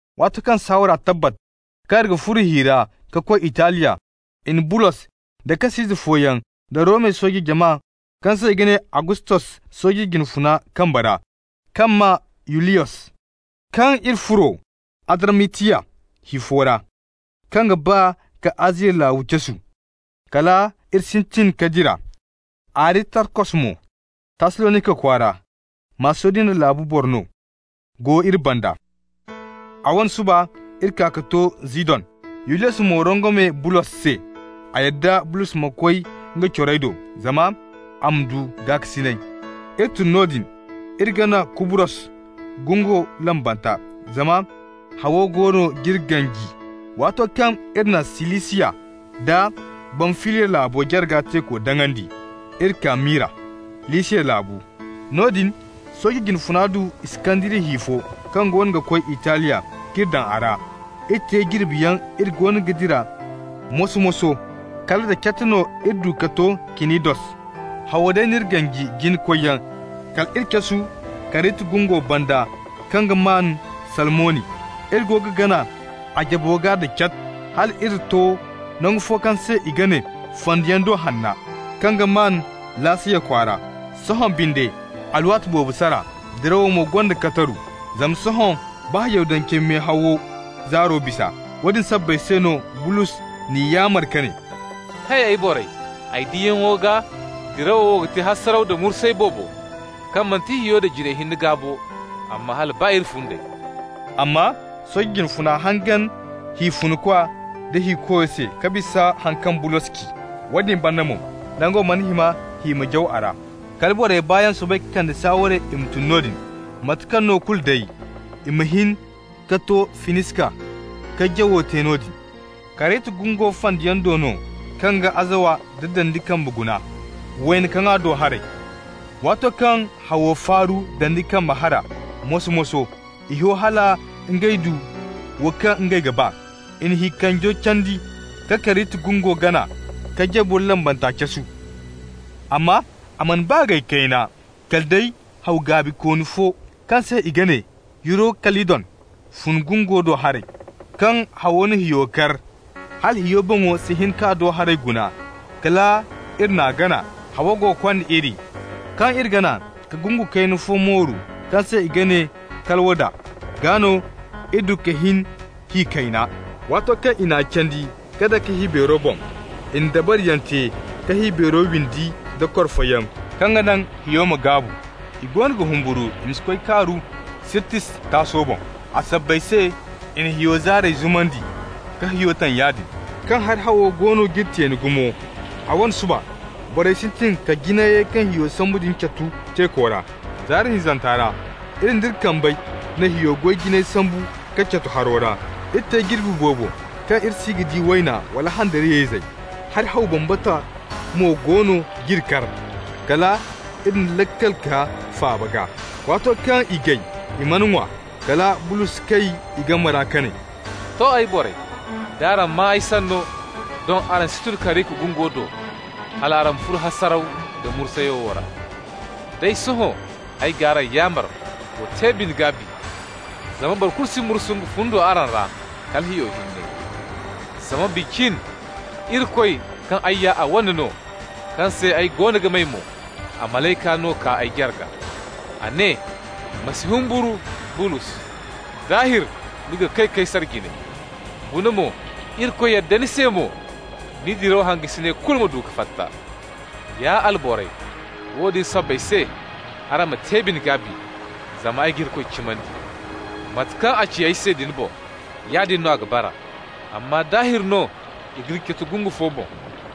Waato kaŋ saawara tabbat kaŋ iri ga furo hi ra ka koy Italiya, i na Bulos da kas'ize fooyaŋ daŋ Romey sooje jama kaŋ se i ga ne Agustos sooje jina funa kambe ra, kaŋ maa Yuliyos. Kaŋ iri furo Adramatiya hi fo ra, kaŋ ga ba ka Aziya laabu casu, kal iri sintin ka dira. Aristarkos mo, Tassalonika kwaara, Masidoniya laabu boro no, go iri banda. A wane suba iri kaa ka to Zidon. Yuliyos mo rongome Bulos se. A yadda Bulos ma koy nga corey do, zama a ma du gaakasinay. Iri tun noodin, iri gana Kubrus gungo lambanta, zama hawo goono g'iri ganji. Waato kaŋ iri na Silisiya da Bamfiliya laabo jarga teeko daŋandi, iri kaa Mira, Lisiya laabu. Noodin sooje jine funa du Iskandariya hi fo kaŋ goono ga koy Italiya k'iri daŋ a ra. Iri te jirbiyaŋ iri goono ga dira moso-moso, kala da cat no iri du ka to Kinidos. Hawo day n'iri ganji jina koyyaŋ kal iri casu Karita gungo banda kaŋ ga maan Salmoni. Iri go ga gana a jabo gaa da cat, hal iri to nangu fo kaŋ se i ga ne Fandiyaŋ Do Hanna, kaŋ ga maan Laseya kwaara. Sohõ binde alwaati boobo sara, dirawo mo gonda kataru, zama sohõ baa Yahudancey mehawo zaaro bisa. Woodin sabbay se no Bulos n'i yaamar ka ne: «Hay, ay borey, ay diyaŋo gaa dirawo wo ga te hasaraw da mursay boobo, kaŋ manti hiyo da jinayey hinne gaa bo, amma hala baa iri fundey.» Amma sooje jine funa hangan hi funkwa da hikoyo se ka bisa haŋ kaŋ Bulos ci. Woodin banda mo, nango mana hima hi ma jaw a ra. Kala borey baayaŋ soobay ka kande saaware i ma tun noodin, mate kaŋ no kulu day, i ma hin ka to Finiska ka jawo te noodin. Karita gungo fandiyaŋ do no kaŋ ga azawa da dandi kambe guna, wayna kaŋa do haray. Waato kaŋ hawo faaru dandi kambe hara moso-moso, i ho hala ngey du wo kaŋ ngey ga ba. I na hi kanjeyo candi ka Karita gungo gana k'a jabo lambanta casu. Amma a mana baa gay kayna kala day haw gaabikooni fo, kaŋ se i ga ne Yurokalidon, fun gungo do haray. Kaŋ hawo na hiyo kar, hala hiyo boŋo si hin k'a do haray guna, kala iri n'a gana, hawo go ga kond'iri. Kaŋ iri gana ka gungu kayna fo mooru kaŋ se i ga ne Kalawda, gaa no iri du ka hin hi kayna. Waato kaŋ i n'a candi ka dake hi beero boŋ, i na dabariyaŋ te ka hi beero windi da korfoyaŋ kaŋ ga naŋ hiyo ma gaabu. I goono ga humburu i ma si koy kaaru Sirtis taaso boŋ. A sabbay se i na hiyo zaarey zumandi, ka hiyo taŋ yaadin. Kaŋ hari hawo goono g'iri teeni gumo, a wane suba borey sintin ka jinayey kaŋ hiyo sambu din catu teeko ra. Zaari hinzanta ra iri nd'iri kambey na hiyo goy jinayey sambu ka catu haro ra. Iri te jirbi boobo kaŋ iri si ga di wayna wala handariyayzey, hari haw bambata mo goono g'iri kar, kal iri na laakal kaa faaba gaa. Waato kaŋ i gay i mana ŋwa, kala Bulos kay i game ra ka ne: «To, ay borey, d'araŋ maa ay sanno, doŋ araŋ si tun Karita gungo do, hal araŋ ma furo hasaraw da mursay wo ra. Day sohõ, ay g'araŋ yaamar, wa te bine-gaabi, zama boro kulu si mursu nga fundo araŋ ra, kala hiyo hinne. Zama bi cin Irikoy, kaŋ ay ya a wane no, kaŋ se ay goono ga may mo, a malayka no kay ay jarga. A ne: ‹Ma si humburu, Bulos. Daahir ni ga kay Kaysar jine. Guna mo, Irikoy yadda ni se mo ni diraw hangasiney kulu ma du ka fatta.› Ya alborey, woodin sabbay se, araŋ ma te bine-gaabi, zama ay ga Irikoy cimandi: mate kaŋ a ci ay se din boŋ, yaadin no a ga bara. Amma daahir no, i g'iri catu gungu fo boŋ.»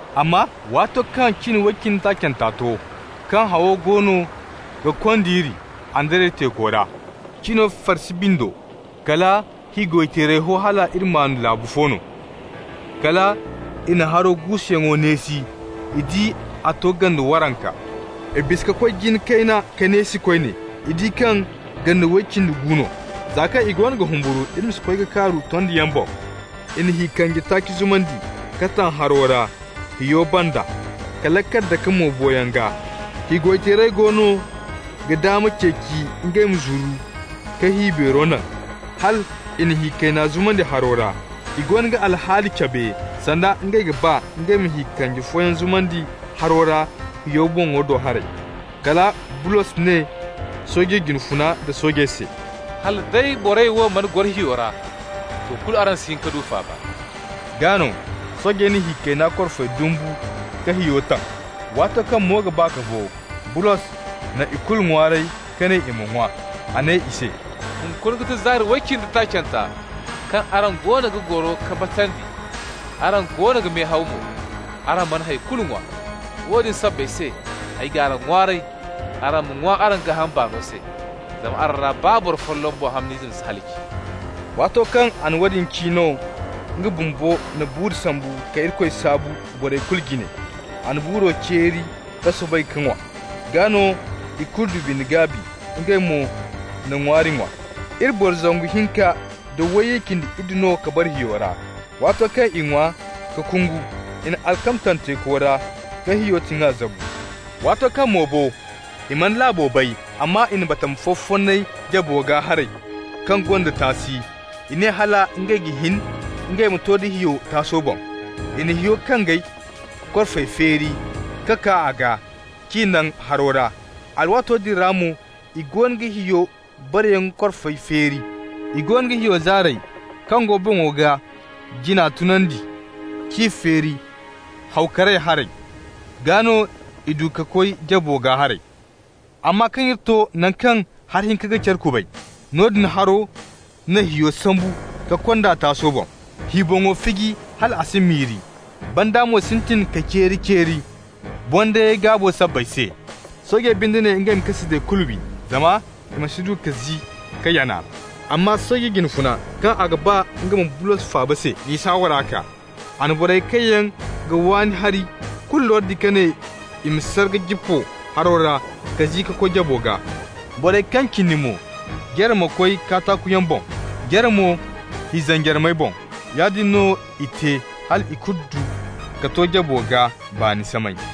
Amma waato kaŋ cin way cindi taacanta to, kaŋ hawo goono ga kond'iri Andariya teeko ra, cino farsi bindo, kala hi goy-teerey ho hal iri maan laabu fo no. Kal i na haro guusuyaŋo neesi, i di a to gande waranka. I bisa ka koy jina kayna ka neesi koyne. I di kaŋ gande way cindi gu no. Za kaŋ i goono ga humburu iri ma si koy ka kaaru tondiyaŋ boŋ, i na hi kanje taaci zumandi ka taŋ haro ra hiyo banda ka laakal dake mo boyaŋ gaa. Hi goy-teerey goono ga daama ceeci ngey ma zuru ka hi beero naŋ, hal i na hi kayna zumandi haro ra. I goono ga alhaali cabe sanda ngey ga ba ngey ma hi kanje fooyaŋ zumandi haro ra hiyo boŋo do haray. Kala Bulos ne sooje jine funa da soojey se: «Hala day borey wo mana goro hiyo ra, to, kulu araŋ si hin ka du faaba.» Gaa no soojey na hi kayna korfey dumbu ka hiyo taŋ. Waato kaŋ mo ga ba ka bo, Bulos na ikulu ŋwaaray ka ne i ma ŋwa. A ne i se: «Hunkuna ga ti zaari way cindi taacanta kaŋ araŋ goono ga goro ka batandi, araŋ goono ga mehaw mo, araŋ mana hay kulu ŋwa. Woodin sabbay se ay g'araŋ ŋwaaray, araŋ ma ŋwa araŋ gaaham baano se, zama araŋ ra baa boro folloŋ boŋ hamn'ize si halaci.» Waato kaŋ a na woodin ci no, nga bumbo na buuru sambu ka Irikoy saabu borey kulu jine. A na buuro ceeri ka soobay ka ŋwa. Gaa no ikulu du bine-gaabi, ngey mo na ŋwaari ŋwa. Iri boro zangu hinka nda wayye cindi iddu no ka bara hiyo ra. Waato kaŋ i ŋwa ka kungu, i na alkama taŋ teeko ra ka hiyo tiŋa zabu. Waato kaŋ mo bo, i mana laabo bay, amma i na batama fo fonnay jabo gaa haray kaŋ gonda taasi. I ne hala ngey ga hin ngey ma to nda hiyo taaso boŋ. I na hiyo kanjey korfey feeri ka kaa a gaa k'i naŋ haro ra. Alwaato din ra mo i goono ga hiyo bareyaŋ korfa feeri. I goono ga hiyo zaarey kaŋ go boŋo gaa jina tunandi k'i feeri hawo karay haray, gaa no i du ka koy jabo gaa haray. Amma kaŋ iri to naŋ kaŋ hari hinka ga care kubay, noodin haro na hiyo sambu ka kond'a taaso boŋ. Hi boŋo fiji hal a si miri, banda mo sintin ka ceeri-ceeri bondayey gaabo sabbay se. Soojey binde ne ngey ma kas'izey kulu wi, zama i ma si du ka zi ka yana. Amma sooje jine funa, kaŋ a ga ba nga ma Bulos faaba se, n'i saawara kaa. A na borey kaŋ yaŋ ga waani hari kulu lordi ka ne i ma sar ka jippo haro ra ka zi ka koy jabo gaa. Borey kaŋ cindi mo, jare ma koy kataakuyaŋ boŋ, jare mo hi zanjarmey boŋ. Yaadin no i te hal ikulu du ka to jabo gaa baani samay.